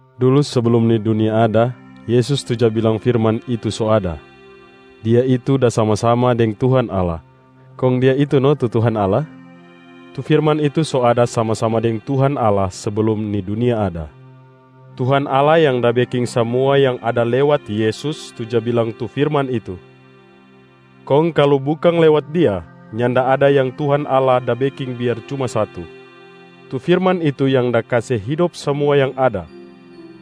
Dulu seblum ni dunia ada, Yesus tu ja bilang firman itu so ada. Dia itu da sama-sama deng Tuhan Allah, kong Dia itu no tu Tuhan Allah. Tu firman itu so ada sama-sama deng Tuhan Allah seblum ni dunia ada. Tuhan Allah yang da beking samua yang ada lewat Yesus tu ja bilang tu firman itu. Kong kalu bukang lewat Dia, nyanda ada yang Tuhan Allah da beking biar cuma satu. Tu firman itu yang da kase hidop samua yang ada,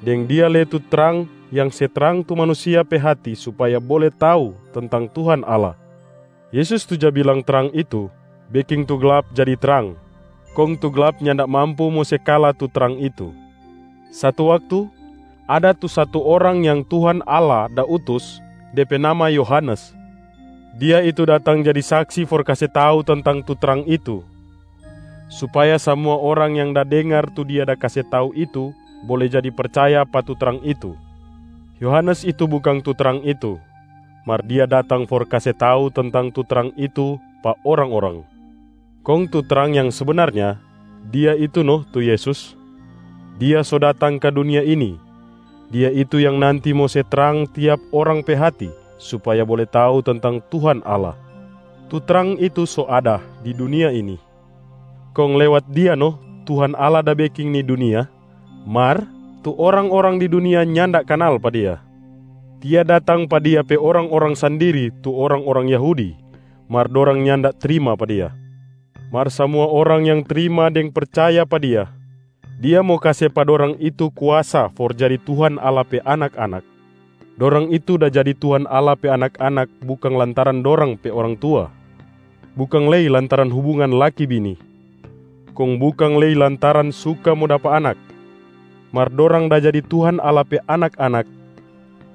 deng Dia lei tu trang yang se trang tu manusia pe hati supaya bole tau tentang Tuhan Allah. Yesus tu ja bilang trang itu, beking tu glap jadi trang, kong tu glap nyanda mampu mo se kala tu trang itu. Satu waktu, ada tu satu orang yang Tuhan Allah da utus, de pe nama Yohanes. Dia itu datang jadi saksi for kase tau tentang tu trang itu, supaya samua orang yang da dengar tu dia da kase tau itu bole jadi percaya pa tu trang itu. Yohanes itu bukang tu trang itu, mar dia datang for kase tau tentang tu trang itu pa orang-orang. Kong tu trang yang sebenarnya, Dia itu no tu Yesus, Dia so datang ka dunia ini. Dia itu yang nanti mo se trang tiap orang pe hati supaya bole tau tentang Tuhan Allah. Tu trang itu so ada di dunia ini, kong lewat Dia no Tuhan Allah da beking ni dunia, mar tu orang-orang di dunia nyanda kanal pa Dia. Dia datang pa Dia pe orang-orang sandiri tu orang-orang Yahudi, mar dorang nyanda trima pa Dia. Mar samua orang yang trima deng percaya pa Dia, Dia mo kase pa dorang itu kuasa for jadi Tuhan Allah pe anak-anak. Dorang itu da jadi Tuhan Allah pe anak-anak bukang lantaran dorang pe orang tua, bukang lei lantaran hubungan laki-bini, kong bukang lei lantaran suka mo dapa anak. Mar dorang da jadi Tuhan Allah pe anak-anak,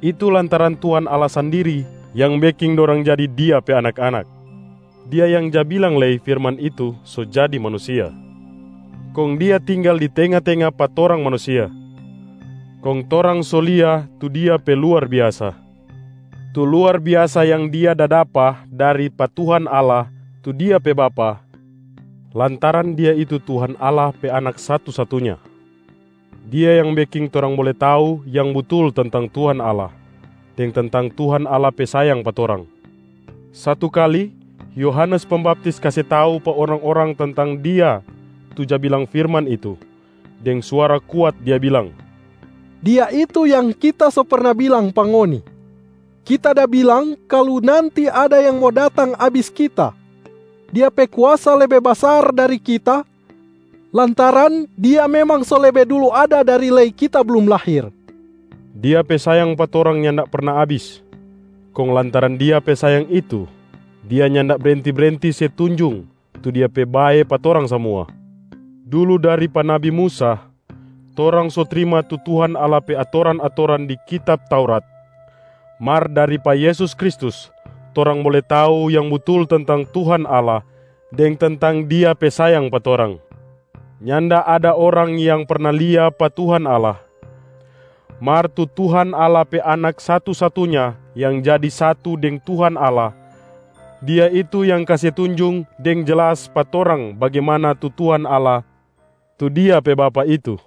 itu lantaran Tuhan Allah sandiri yang beking dorang jadi Dia pe anak-anak. Dia yang ja bilang lei firman itu so jadi manusia, kong Dia tinggal di tenga-tenga pa torang manusia. Kong torang so lia tu Dia pe luar biasa, tu luar biasa yang Dia da dapa dari pa Tuhan Allah tu Dia pe Bapa, lantaran Dia itu Tuhan Allah pe Anak satu-satunya. Dia yang beking torang bole tau yang butul tentang Tuhan Allah deng tentang Tuhan Allah pe sayang pa torang. Satu kali, Yohanes Pembaptis kase tau pa orang-orang tentang Dia tu ja bilang firman itu, deng suara kuat dia bilang, “Dia itu yang kita so perna bilang pa ngoni! Kita da bilang kalu nanti ada yang mo datang abis kita, Dia pe kuasa lebe basar dari kita lantaran Dia memang so lebe dulu ada dari lei kita blum lahir.” Dia pe sayang pa torang nyanda perna abis. Kong lantaran Dia pe sayang itu, Dia nyanda brenti-brenti se tunjung tu Dia pe bae pa torang samua. Dulu dari pa nabi Musa, torang so trima tu Tuhan Allah pe atoran-atoran di kitab Taurat. Mar dari pa Yesus Kristus, torang bole tau yang butul tentang Tuhan Allah deng tentang Dia pe sayang pa torang. Nyanda ada orang yang perna lia pa Tuhan Allah, mar tu Tuhan Allah pe Anak satu-satunya yang jadi satu deng Tuhan Allah, Dia itu yang kase tunjung deng jelas pa torang bagimana tu Tuhan Allah tu Dia pe Bapa itu.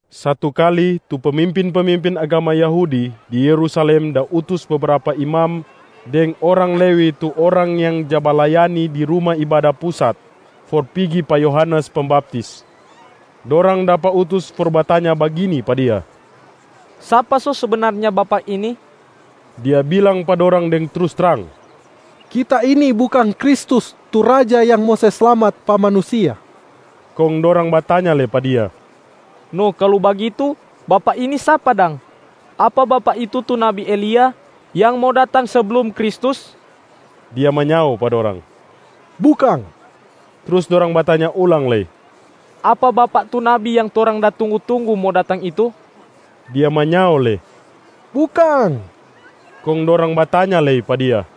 Satu kali, tu pemimpin-pemimpin agama Yahudi di Yerusalem da utus bebrapa imam deng orang Lewi tu orang yang ja balayani di Ruma Ibada Pusat for pigi pa Yohanes Pembaptis. Dorang dapa utus for batanya bagini pa dia, “Sapa so sebenarnya bapak ini?” Dia bilang pa dorang deng trus trang, “Kita ini bukang Kristus, tu Raja yang mo se slamat pa manusia.” Kong dorang batanya lei pa dia, “No kalu bagitu, bapak ini sapa dang? Apa bapak itu tu nabi Elia yang mo datang seblum Kristus?” Dia manyao pa dorang, “Bukang!” Trus dorang batanya ulang lei, “Apa bapak tu nabi yang torang da tunggu-tunggu mo datang itu?” Dia manyao lei, “Bukang!” Kong dorang batanya lei pa dia,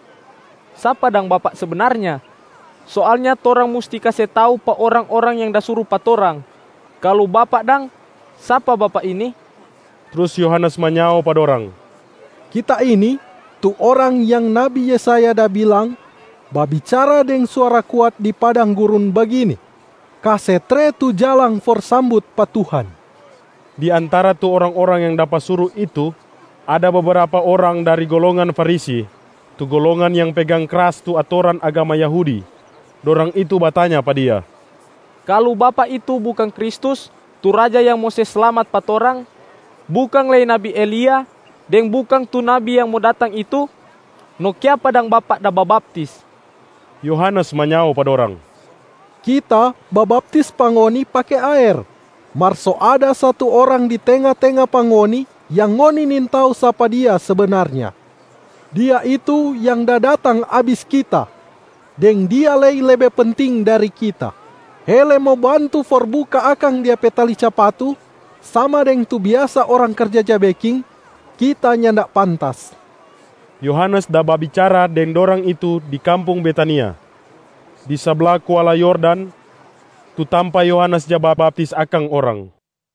“Sapa dang bapak sebenarnya? Soalnya torang musti kase tau pa orang-orang yang da suru pa torang. Kalu bapak dang, sapa bapak ini?” Trus Yohanes manyao pa dorang, “Kita ini tu orang yang nabi Yesaya da bilang babicara deng suara kuat di padang gurun bagini, ‘Kase tre tu jalang for sambut pa Tuhan!’” Di antara tu orang-orang yang dapa suru itu, ada bebrapa orang dari golongan Farisi, tu golongan yang pegang kras tu atoran agama Yahudi. Dorang itu batanya pa dia, “Kalu bapak itu bukang Kristus tu Raja yang mo se slamat pa torang, bukang lei nabi Elia deng bukang tu nabi yang mo datang itu, no kiapa dang bapak da babaptis?” Yohanes manyao pa dorang, “Kita babaptis pa ngoni pake aer, mar so ada satu Orang di tenga-tenga pa ngoni yang ngoni nintau sapa Dia sebenarnya. Dia itu yang da datang abis kita, deng Dia lei lebe penting dari kita. Hele mo bantu for buka akang Dia pe tali capatu sama deng tu biasa orang karja ja beking, kita nyanda pantas.” Yohanes da babicara deng dorang itu di kampung Betania, di sabla kuala Yordan, tu tampa Yohanes ja babaptis akang orang.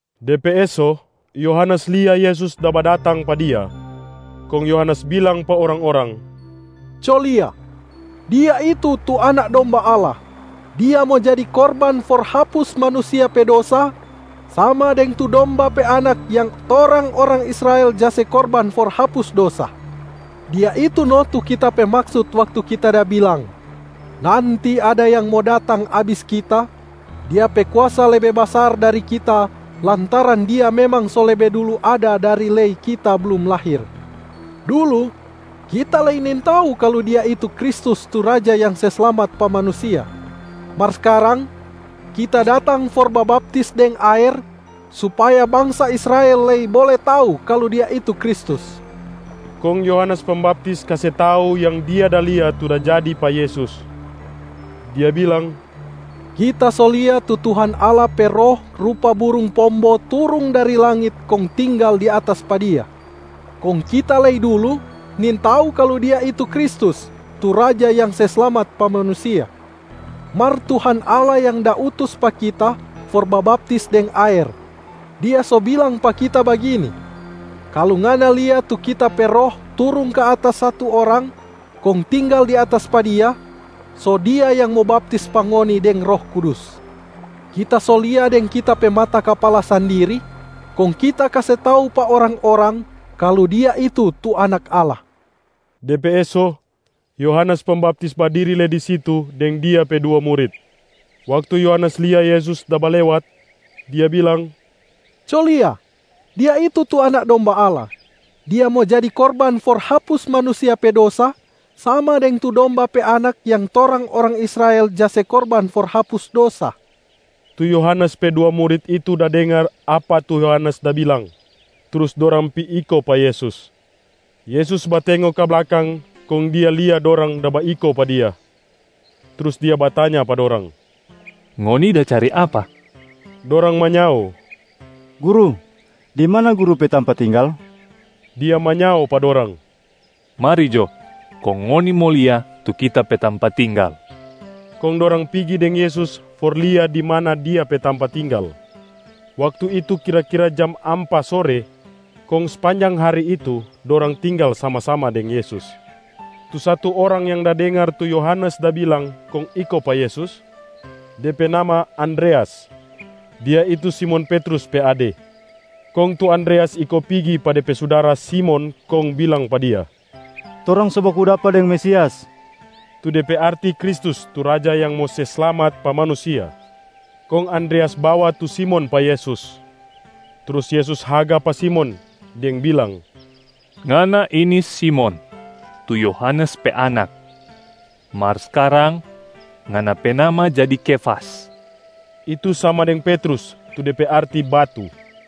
De pe eso, Yohanes lia Yesus da badatang pa dia. Kong Yohanes bilang pa orang-orang, “Co lia, Dia itu tu Anak Domba Allah. Dia mo jadi korban for hapus manusia pe dosa, sama deng tu domba pe anak yang torang orang Israel ja se korban for hapus dosa. Dia itu no tu kita pe maksut waktu kita da bilang, ‘Nanti ada yang mo datang abis kita, Dia pe kuasa lebe basar dari kita lantaran Dia memang so lebe dulu ada dari lei kita blum lahir.’ Dulu, kita lei nintau kalu Dia itu Kristus tu Raja yang se slamat pa manusia. Mar skarang kita datang for babaptis deng aer, supaya bangsa Israel lei bole tau kalu Dia itu Kristus.” Kong Yohanes Pembaptis kase tau yang dia da lia tu da jadi pa Yesus, dia bilang, “Kita so lia tu Tuhan Allah pe Roh rupa burung pombo turung dari langit kong tinggal di atas pa Dia. Kong kita lei dulu nintau kalu Dia itu Kristus, tu Raja yang se slamat pa manusia. Mar Tuhan Allah yang da utus pa kita for babaptis deng aer, Dia so bilang pa kita bagini, ‘Kalu ngana lia tu Kita pe Roh turung ka atas satu Orang kong tinggal di atas pa Dia, so Dia yang mo baptis pa ngoni deng Roh Kudus.’ Kita so lia deng kita pe mata kapala sandiri, kong kita kase tau pa orang-orang kalu Dia itu tu Anak Allah.” De pe eso, Yohanes Pembaptis badiri lei di situ deng dia pe dua murit. Waktu Yohanes lia Yesus da balewat, dia bilang, “Co lia, Dia itu tu Anak Domba Allah. Dia mo jadi korban for hapus manusia pe dosa, sama deng tu domba pe anak yang torang orang Israel ja se korban for hapus dosa.” Tu Yohanes pe dua murit itu da dengar apa tu Yohanes da bilang, trus dorang pi iko pa Yesus. Yesus batengo ka blakang kong Dia lia dorang da baiko pa Dia. Trus Dia batanya pa dorang, “Ngoni da cari apa?” Dorang manyao, “Guru, di mana Guru pe tampa tinggal?” Dia manyao pa dorang, “Mari jo kong ngoni mo lia tu Kita pe tampa tinggal.” Kong dorang pigi deng Yesus for lia di mana Dia pe tampa tinggal. Waktu itu kira-kira jam ampa sore kong spanjang hari itu dorang tinggal sama-sama deng Yesus. Tu satu orang yang da dengar tu Yohanes da bilang kong iko pa Yesus, de pe nama Andreas. Dia itu Simon Petrus pe ade. Kong tu Andreas iko pigi pa de pe sudara Simon kong bilang pa dia, “Torang so baku dapa deng Mesias.” (Tu de pe arti Kristus tu Raja yang mo se slamat pa manusia). Kong Andreas bawa tu Simon pa Yesus. Trus Yesus haga pa Simon deng bilang, “Ngana ini Simon, tu Yohanes pe anak. Mar skarang ngana pe nama jadi Kefas.” (Itu sama deng Petrus tu de pe arti batu).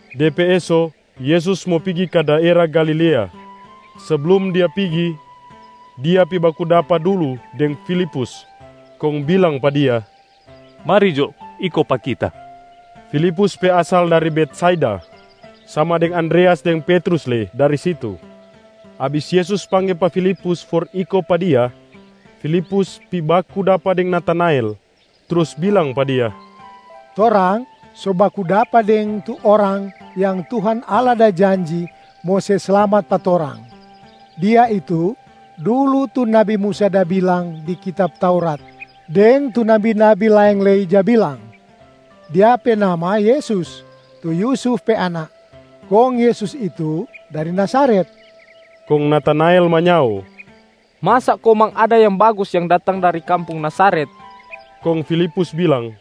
De pe eso, Yesus mo pigi ka daera Galilea. Seblum Dia pigi, Dia pi baku dapa dulu deng Filipus kong bilang pa dia, “Mari jo iko pa Kita!” Filipus pe asal dari Betsaida, sama deng Andreas deng Petrus lei dari situ. Abis Yesus pangge pa Filipus for iko pa Dia, Filipus pi baku dapa deng Natanael trus bilang pa dia, “Torang so baku dapa deng tu Orang yang Tuhan Allah da janji mo se slamat pa torang. Dia itu dulu tu nabi Musa da bilang di kitab Taurat deng tu nabi-nabi laeng lei ja bilang. Dia pe nama Yesus, tu Yusuf pe anak. Kong Yesus itu dari Nazaret.” Kong Natanael manyao, “Masa komang ada yang bagus yang datang dari kampung Nazaret.” Kong Filipus bilang,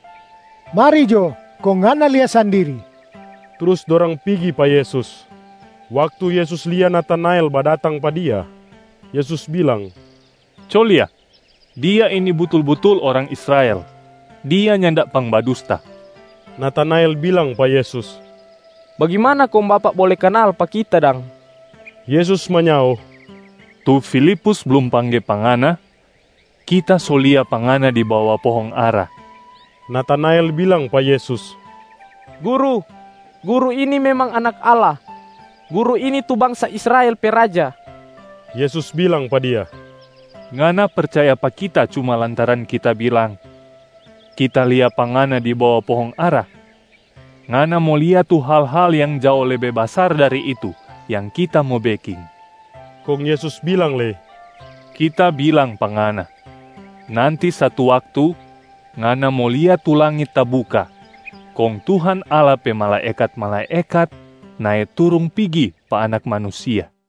“Mari jo kong ngana lia sandiri!” Trus dorang pigi pa Yesus. Waktu Yesus lia Natanael badatang pa Dia, Yesus bilang, “Co lia, dia ini butul-butul orang Israel, dia nyanda pangbadusta.” Natanael bilang pa Yesus, “Bagimana kong Bapak bole kanal pa kita dang?” Yesus manyao, “Tu Filipus blum pangge pa ngana, Kita so lia pa ngana di bawa pohong ara.” Natanael bilang pa Yesus, “Guru, Guru ini memang Anak Allah. Guru ini tu bangsa Israel pe Raja.” Yesus bilang pa dia, “Ngana percaya pa Kita cuma lantaran Kita bilang ‘Kita lia pa ngana di bawa pohong ara?’ Ngana mo lia tu hal-hal yang jao lebe basar dari itu yang Kita mo beking.” Kong Yesus bilang lei, “Kita bilang pa ngana, nanti satu waktu ngana mo lia tu langit tabuka kong Tuhan Allah pe malaekat-malaekat nae turung pigi pa Anak Manusia.”